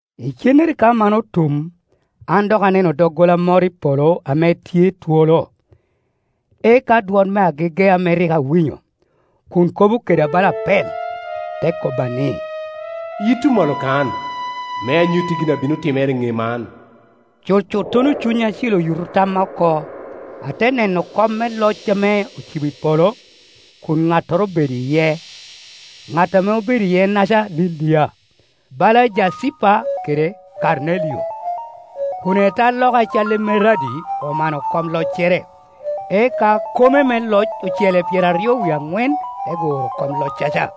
Icennere ka man otum, an dok aneno doggola moro i polo ame tye twolo. Eka dwon me agege ame rik awinyo, kun kobo keda bala apel, te kobba ni, “Yitto malo kan, me anyutti gin a bino timere i ŋe man,” Cucuttono Cuny Acil oyuto tamma oko, ate neno kom me loc ame ocibo i polo, kun ŋattoro obedo iye. Ŋat ame obedo iye-naca lilia, bala jacipa kede kamelio, kun etaloka a calli emeradi omano kom loccere. Eka kome me loc ocele pyeraryo wie aŋwen te guro kom loccaca,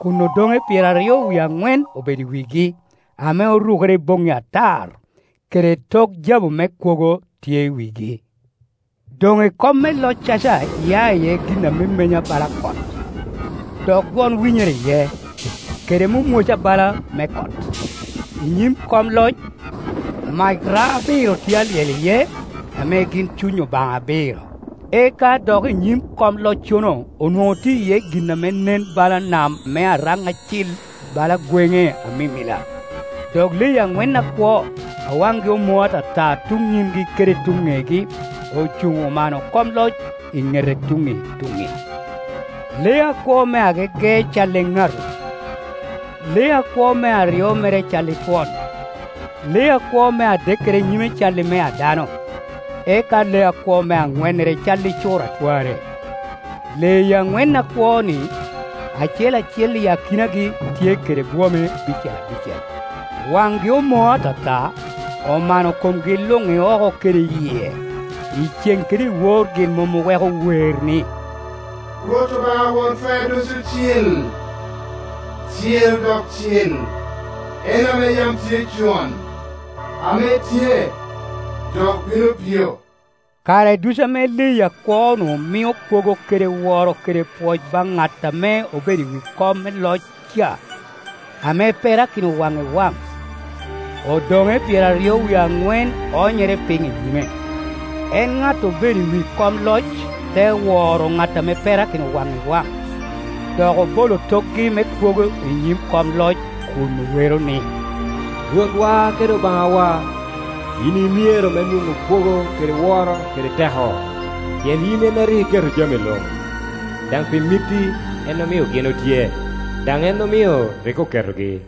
kun odoŋe pyeraryo wie aŋwen obedo i wigi, ame orukere i boŋŋi atar, kede tok jabu me kwogo tye i wigi. Doŋ i kom me loccaca ya iye gin a memenya bala kot, dok dwon winyere iye, kede mwomwoca bala me kot. I nyim kom loc, mac rao abiro tye alyel iye, ame gin cuny Obaŋa abiro. Eka dok i nyim kom loccono onwoŋo tye iye gin ame nen bala nam me araŋ acil bala gweŋe amimila. Dok leyi aŋwen akwo, a waŋgi omoo atata tuŋ nyimgi kede tuŋ ŋegi ocuŋ omano kom loc i ŋete tuŋŋi i tuŋŋi. Lee akwo me agege calli eŋatu, lee akwo me aryo mere calli twon, lee akwo me adekkere nyime calli i me dano, eka lee akwo me aŋwennere cal i cur a twarre. Leyi aŋwen akwo-ni, acel acel i akinagi tye kede bwome abicel abicel, waŋgi omoo ata ta, omano komgi luŋ i oko kede i yie. Icen kede iwor gin mom oweko wer ni, “Rwot Obaŋa Won Twer Ducu cil, cil dok cil, en ame yam tye con, ame tye, dok bino bio!” Kare ducu ame leyi akwo-nu mio kwogo kede woro kede pwoc baŋ ŋat ame obedo i wi kom me loc ca, ame perakino wan i waŋ, odoŋe pyeraryo wie aŋwen oonyere piny i nyime, en ŋat obedo i wi kom loc, te woro ŋat ame perakino waŋ i waŋ, dok obolo tokgi me kwogo i nyim kom loc kun owero ni, “Rwotwa kede Obaŋawa, yin i myero me nwoŋo kwogo kede woro kede teko, pien yin en a rik iketo jami luŋ, daŋ pi mitti en omio gin otye, daŋ en omio rii oketegi.”